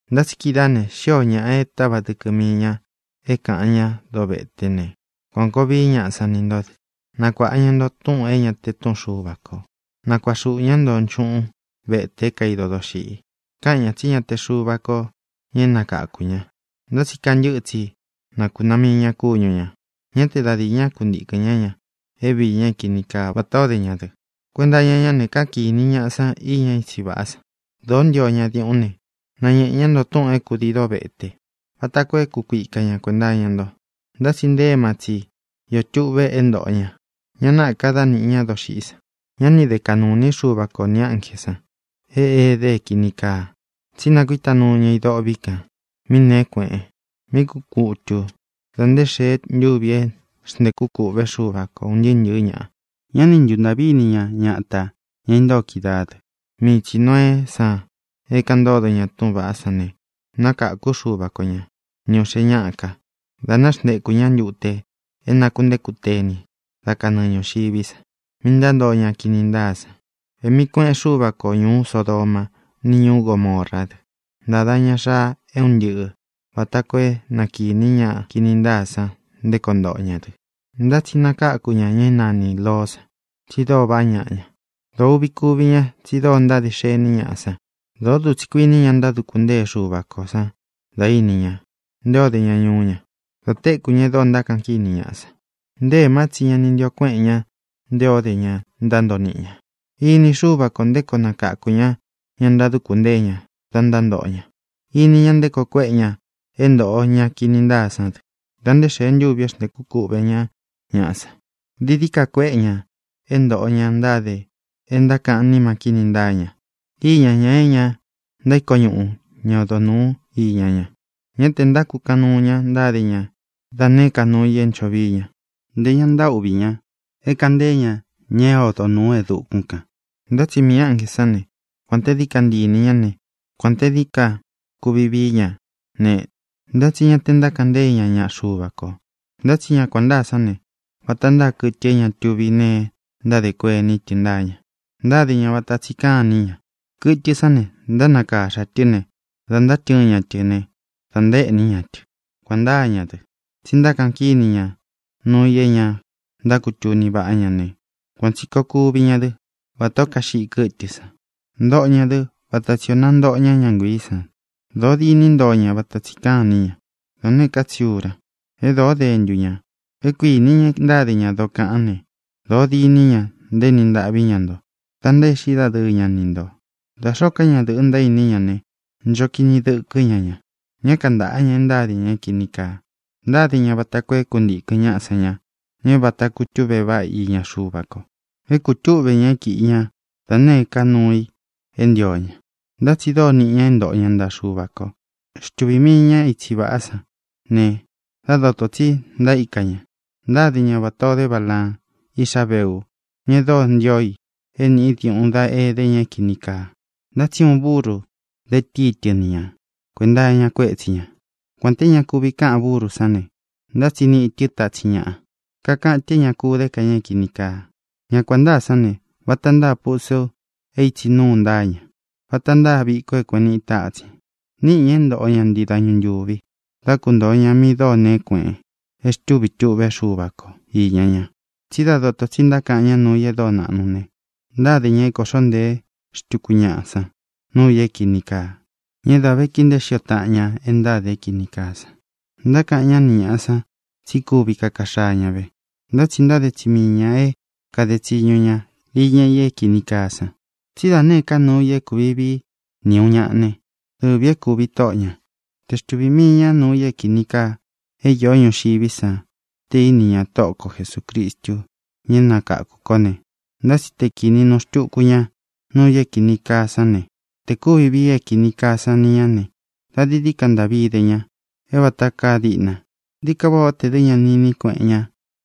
Ntá tsi kídaā ne, xíō ñaꞌa e táva dɨkɨ mii ña é kāꞌan ñá doveté ne, kuān koo vií ñaꞌa san ni ntó dɨ. Nakuāꞌa ña nto túꞌūn é ña te túꞌun Xuva kō. Nakuaꞌa xuꞌū ñá nto nchúꞌun vetē é kaido doxiꞌi. Káꞌan ñā tsí ña te Xuva kō ña é nakakū ña. Ntá tsi kantɨ́ꞌɨ tsi nakūnaá mii ñā kúñu ñā. Ñá te da dīi ñaꞌa kuntíkɨn ñá ña é viī ña é kini kaa vatā ó de ña dɨ. Kuenta iña ñá ne, káꞌan kīni ñaꞌa san íña itsí vaꞌá san. Dōó ntio ña diuꞌún ne, nañēꞌe ñá nto túꞌūn é kūdií dovete vata koo é kukuika ña kuēnta iña nto. Ntá tsi nte éma tsi iō tuꞌve é ntōꞌo ña. Ña náꞌā ka dá nīꞌi ñá doxiꞌí san. Ñá ni de kaꞌnū iní Xuva ko nī ánjē san é ede é kīni kaa, tsí nakuíta nuu ña i dôꞌvi kan mí nēé kueꞌen, mí kuꞌun kutu dā nté xēe ntúvi é xntēkú kūꞌvé Xuva ko ūn ntɨɨ́ ntɨ̄ɨ́ ñaꞌa. Ñá ni ntuntāꞌví ini ña ñatā, ña intóo kídaā dɨ. Mii tsī Noeé san é kāꞌan ntódo ña túꞌūn vaꞌá san ne, nákākú Xuva ko ña, ni ūꞌxe ñáꞌa ká, dā náxntekū ñá ntute é nakūntéku teni dá kanɨɨ ñūxiví san, mi ntántoo ña kini ntáa san. Ēꞌmi kueꞌen Xúva ko ñūú Sodomá, ni ñūú Gomorá dɨ. Ntāda ña xaa é un ntɨꞌɨ̄, vata koo é na kīní ña kini ntáa san nté koo ntoꞌo ña dɨ. Ntá tsi nakáku ña ña é nanī Loó san, tsi dóo vaꞌá ñaꞌa ña. Dōo uꞌvi kúvi ña tsi dóo ntáde xení ñaꞌa san. Dōó dutsī kuíni ña ntáduku ntée Xuva ko san dā íni ña nté o de ña ñuú ña, da téku ñā e dóo ntákaꞌan kíni ñaꞌa san. Nté ēmá tsi ña ni ntio kuéꞌen ña nté o de ña ntántoo niꞌi ña. Ini Xúva kō nté koo nakáku ña ña ntáduku ntée ña da ntántoꞌo ña. Ini ña nté koo kuéꞌe ña é ntōꞌo ñá kini ntáa sán dɨ dā nté xēe ntúvi é xntēkú kuꞌvē ñá ñaꞌa san. Dií dií ka kuéꞌe ña é ntōꞌo ña ntáde e ntákaꞌan níma kíni ntáa ña, iña ña é ña ntaíko ñuꞌu ña odo nūu íña ña. Ñá tē ntákukaꞌan nuu ña; ntáde ña da nēé ka nuu i é ncho vií ña. Ntē ña ntaúꞌvi ña é kāꞌan ntee ña ña é odo nūu e dukún kān. Ntá tsi miī ánjē sán ne, kuān te dií ka ntii inī ñá ne, kuān te dií ka kuvi vií ña ne, ntá tsi ña te ntákaꞌan ntée ña ña nuu Xuva ko. Ntá tsi ña kuān ntáa sán ne, vata ntáa kɨtɨ é ña tuví nee ntáde kuení tɨ ntáa ña. Ntáde ña vata tsi káan iní ña. Kɨtɨ sán ne, ntánakaxa tɨ ne, da ntátɨɨn ña tɨ ne, da ntaéꞌni ñá tɨ. Kuan ntáa ña dɨ. Tsi ntákaꞌan kíni ña nuu i é ña ntákutuni váꞌa ña ne, kuān tsi koo kuví ña dɨ vatā ó kaxiꞌi kɨ́tɨ san. Ntoꞌo ñā dɨ́ vata tsi ō nántoꞌo ña ña nguíī san. Dōó diní ntoo ña vata tsi káan iní ña, da nēé ka tsi ura. E dóo dentu ña. É kuīni ña e ntáde ña dokaꞌan ne, dōo diní ña ntaéni ntaꞌví ña nto da ntaéꞌxi dadɨɨ ña ni ntō. Da xōó ka ñadɨ̄ꞌɨ ntaíni ña ne, ncho kini dɨkɨ́ ña ña. Ñá kantāꞌá ña e ntáde ña é kīni kaa. Ntáde ña vata koo é kuntīkɨn ñaꞌa san ña, ña é vata kutúꞌve váꞌa i iña Xuva ko. É kūtúꞌve ña é kiꞌi ña da nēé ka nuu i é ntio ña. Ntá tsi dóo niꞌi ña é ntoꞌo ña ntaꞌa Xuva kō. Xtuvī mii ña itsí vaꞌá san ne, dá dotō tsi ntaíka ña. Ntáde ña vatā o dé Balaan, iꞌxá Beu, ña e dóo ntío i é nīꞌi diuꞌun dá edé ña é kīni kaa. Ntá tsi uun buru de tíi tɨ ni ña kuēnta iña kuétsi ñā. Kuān té ña kuvi káꞌan búru sán ne, ntá tsi níꞌi tɨ tatsin ñáꞌa, kakaꞌan tɨ é ña ku dé ka ña é kīni kaa. Ña kuān ntáa sán ne, vata ntáa pusu é ītsi núu ntáa ña, vata ntáa viko é kueꞌen niꞌi tatsin. Níꞌi ñā é ntōꞌo ña ntii dañu ntuvi dá kuntōo ña mi dóo nēé kueꞌen, e xtûví tuꞌvé Xuva ko īña ña. Tsí da doto tsi ntákaꞌan ñá nuu i e dóo naꞌnu ne, ntáde ña é kōꞌxó ntēé xtuku ñaꞌa san nuu i é kīni kaa, ña é dā vé kii nteé xio taꞌan ña e ntáde é kīni kaa san. Ntákaꞌan ñá ni ñāꞌa san tsí kuvi kaka xaa ña ve, ntá tsi ntáde tsi mii ñā é kāde tsiñu ña iña i é kīni kaa san. Tsí da nēé ka nuu i é kuvi vii ni ūun ñaꞌa ne, dɨvī é kūvi tóꞌo ñā. Te xtuvī mii ña nuu i é kīni kaa é īó ñuxiví san te íni ña Tóꞌo ko Jesūcristu, ña é nakáku kō ne, ntá tsi te kīni nuu xtúku ña nuu i é kīni kaa sán ne, te kūvi vii é kīni kaa san ni ñá ne, da dií dií ka ntaꞌví de ña é vāta kaa diꞌna. Dií ka váꞌā ó tē dɨ́ ña ni iní kueꞌen ña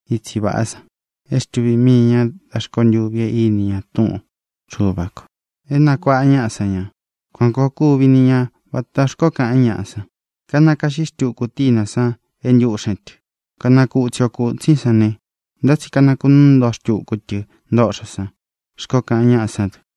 itsi vāꞌá san é xtuvī mii ña da rkontûvi é ini ña túꞌun Xuva kō é nakuāꞌa ñaꞌa san ña. Kuan kōo kúvi ni ña vatā xkoó kaꞌan ñáꞌa san: “Kanakaꞌxí xtuku tínā san e ntúꞌxen tɨ. Kanakutsi o kūtsín san ne, ntá tsi kanakunúu ntoꞌo xtuku tɨ ntoꞌxo san”, xkoó kaꞌan ñáꞌa sán dɨ.